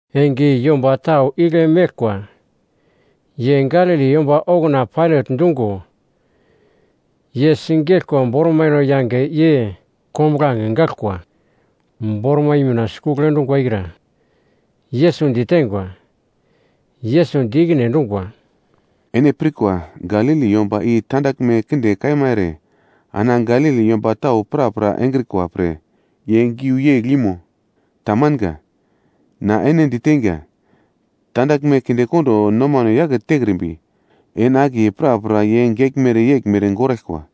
Enge i yomba tau igle meglkwa ye Galili yomba okuna Pailat dungo ye sigeglko bormaino yange ye kombuglange gaglkwa bormai mina sikugl endungwa i kra Yesus ditengwa. Yesus di ikine endungwa, “Ene pirkwa Galili yomba i tandaglme kinde kaima ere ana Galili yomba tau prapra engrikwa pre ye giu yegl imo? Tamanga, na ene diteinga, tandaglme kindekondo nomano yake tekrimbi, ene akiye prapra ye geglmere yeglmere goraglkwa.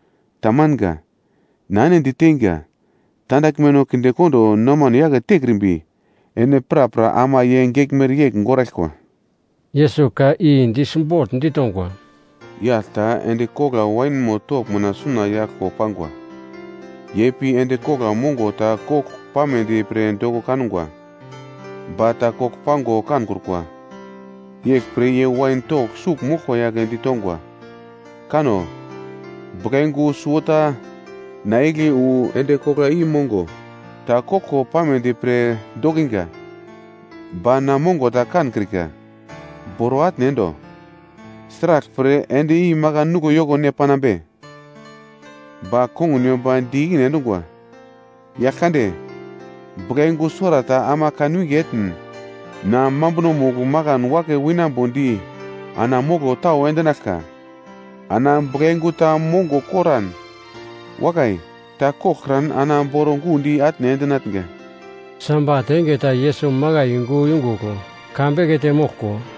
Tamanga. Na ene diteinga, tandaglmeno kindekondo nomano yake tekrimbi, ene prapra ama ye geglmere yegl goraglkwa.” Yesus ka i di simbogl ditongwa, “Yagl ta endi kogla wainmo togl mina suna yaglko pangwa, ye pi endi kogla mongo ta kogl pamedi pre doko kangwa, ba ta kogl pango kankrukwa. Yeglpre ye wain togl sugl moglkwa yagle ditongwa, ‘Kano! Buglayungu suwota na igle wu, endi kogla i mongo ta kogl pamedi pre dokinga, ba na mongo ta kankrika. Boro atne endo! Sraglpre endi i makan nuglo yoko ne panambe?’ “Ba kongun yomba di ikine endungwa, ‘Yagl kande, buglayungu suwarata ama kanwinge etn, na mambunomugl makan wake winambodi ana moglo tau endinaglka. Ana buglayungu ta mongo koran, wakai! Ta koglkran ana boro gundi atne endinatnga.’” Sabat enge ta Yesus makai yungu yungugl ka bekete moglko,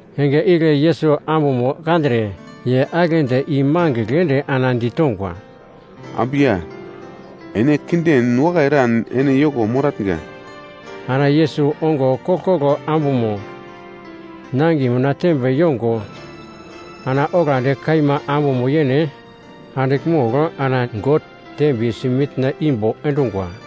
Enge igle Yesus ambumo kandre ye agle di i mangigl ende ana ditongwa, “Ambu ya, ene kinden wakai eran ene yoko moratnga.” Ana Yesus ongo koglkoglo ambumo nangiye mina tembe yongo ana oglandi kaima ambumo yene andigl mogl ana God dembiyesi mitna imbo endungwa.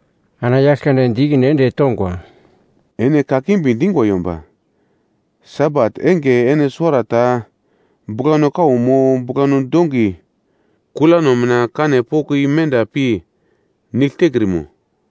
Ana Yaglkande di ikine ende tongwa, “Ene kakimbi dingwa yomba! Sabat enge ene suwarata buglano kau mo buglano dongi kulano mina kanno poko i menda pi nigl tekrimo?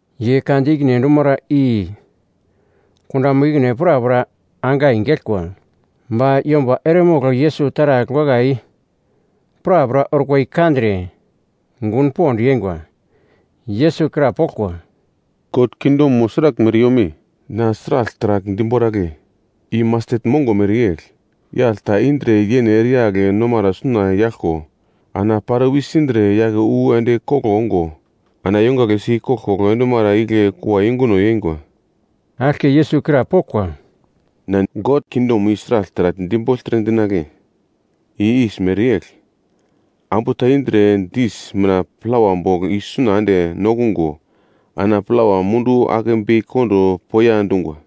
Ye ka di ikine endumara i kundamo ikine prapra angai geglkwa. Ba yomba eremogl Yesus taragl wakai prapra orkwa i kandre gun pond yeingwa. Yesus krapoglkwa, “God kingdomo sraglmere yome? Na sragl taragl diboragle? I mastet mongo mereyegl, yagl ta indre yene ereyagl nomara suna yaglko, ana pare wisindre yake wu endi koglo ongo, ana yongagle si koglkoglo endumara igle kua yunguno yeingwa.” Aglke Yesus krapoglkwa, “Na God kingdomo i sragl taragl dibogltre dinagle? I yis mereyegl, ambu ta indre dis mina plawa bogl i suna ende nokungo ana plawa mundu ake bei kondo poiya dungwa.”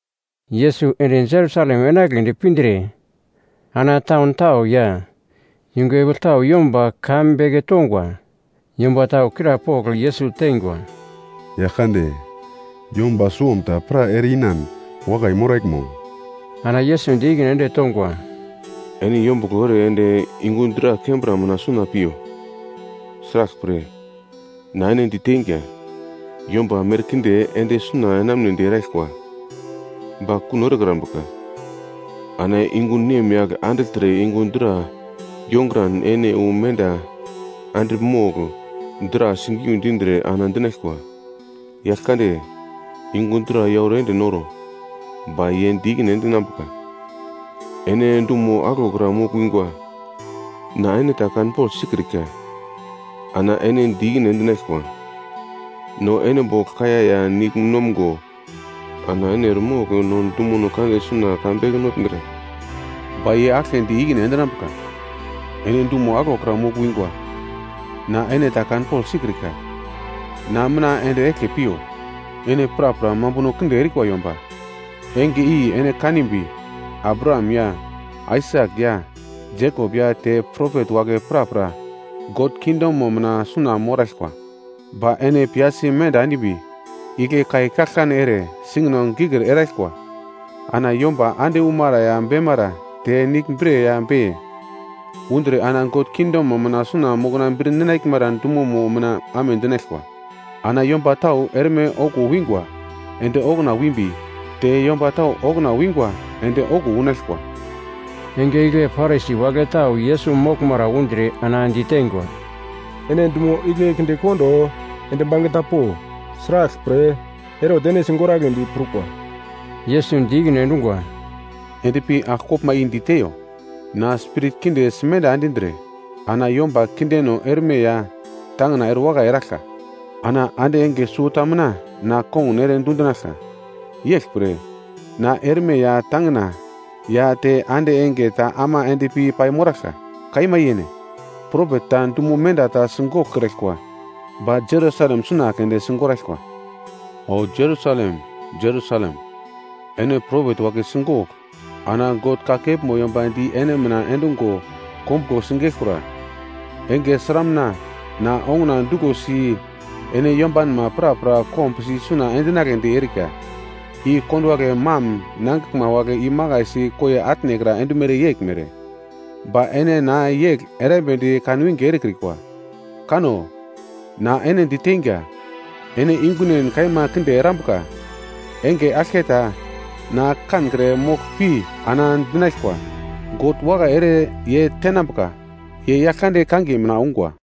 Yesus ende Jerusalem enagledi pindre ana taun tau ya yungu epigl tau yomba ka beke tongwa. Yomba tau krapogl Yesus teingwa, “Yaglkande, yomba suwomta pra ere-inan wakai moraglmo?” Ana Yesus di ikine ende tongwa, “Ene yombuglo ere ende yungu dra kembra mina suna piyo. Sraglpre, na ene diteinga, yomba merkinde ende suna enamunedi eraglkwa, ba kuno erekrambuka. Ana yungu nemyagl andigltre yungu dra yonguran ene wu menda andigl mogl dra sigiu dindre ana dinaglkwa, ‘Yagl kande, yungu dra yauro ende noro.’ “Ba ye di ikine endinambuka, ‘Ene dumo aglokra mogl wingwa. Na ene ta kanpogl sikrika.’ “Ana ene di ikine endinaglkwa, ‘No ene bogl kaiya ya nigl nomgo, ana ene eremogl no dumono kande suna ka beke notngra.’ “Ba ye aglke di ikine endinambuka, ‘Ene dumo aglokra mogl wingwa, na ene ta kanpogl sikrika. Na mina ende eglke piyo, ene prapra mambuno kinde erikwa yomba.’ “Enge i ene kanimbi, Abraham ya Aisak ya Jekop ya te propet wagle prapra God kingdomo mina suna moraglkwa. Ba ene piyasi menda endimbi, igle kai kaglkane ere singino gikir eraglkwa. Ana yomba ande umara ya beimara te nigl bre ya beiye undre ana God kingdomo mina suna mokna bir ninaglmara dumono mina amedinaglkwa. Ana yomba tau erme okuwo wingwa ende okuna wimbi, te yomba tau okuna wingwa ende okuwo unaglkwa.” Enge igle Parisi wagle tau Yesus moglmara undre ana diteingwa, “Ene dumo igle kinde kondo ende bangeta po. Sraglpre, Herot ene sigoragledi prukwa.” Yesus di ikine endungwa, “Endpi agl koglma i diteiyo, ‘Na spirit kinde simenda endindre ana yomba kindeno erme ya tangina erewakai eraglka. Ana ande enge suwota mina na konguna ere dundinaglka.’ Yeglpre, na erme ya tangina ya te ande enge ta ama endpi paimoraglka. Kaima yene, propet ta dumo menda ta sigoglkraglkwa ba Jerusalem suna keunde sigoraglkwa. “O Jerusalem, Jerusalem, ene propet wagle sigogl ana God kakepmo yomba di ene mina endungo kombuglo sigeglkura. Enge sramuna na onguna duglosi ene yombanma prapra kombusi isuna endinagledi erika, i konduwagle mam nangiglma wagle imakai si koiye atnekra endumere yeglmere, ba ene na yegl erambedi kanwinge erekrikwa. Kanno, na ene diteinga, ene yungunen kaima kinde erambuka. Enge aglketa na kankre moglpi ana dinaglkwa, ‘God wakai ere ye tenambuka, ye Yaglkande kangiye mina ungwa.’”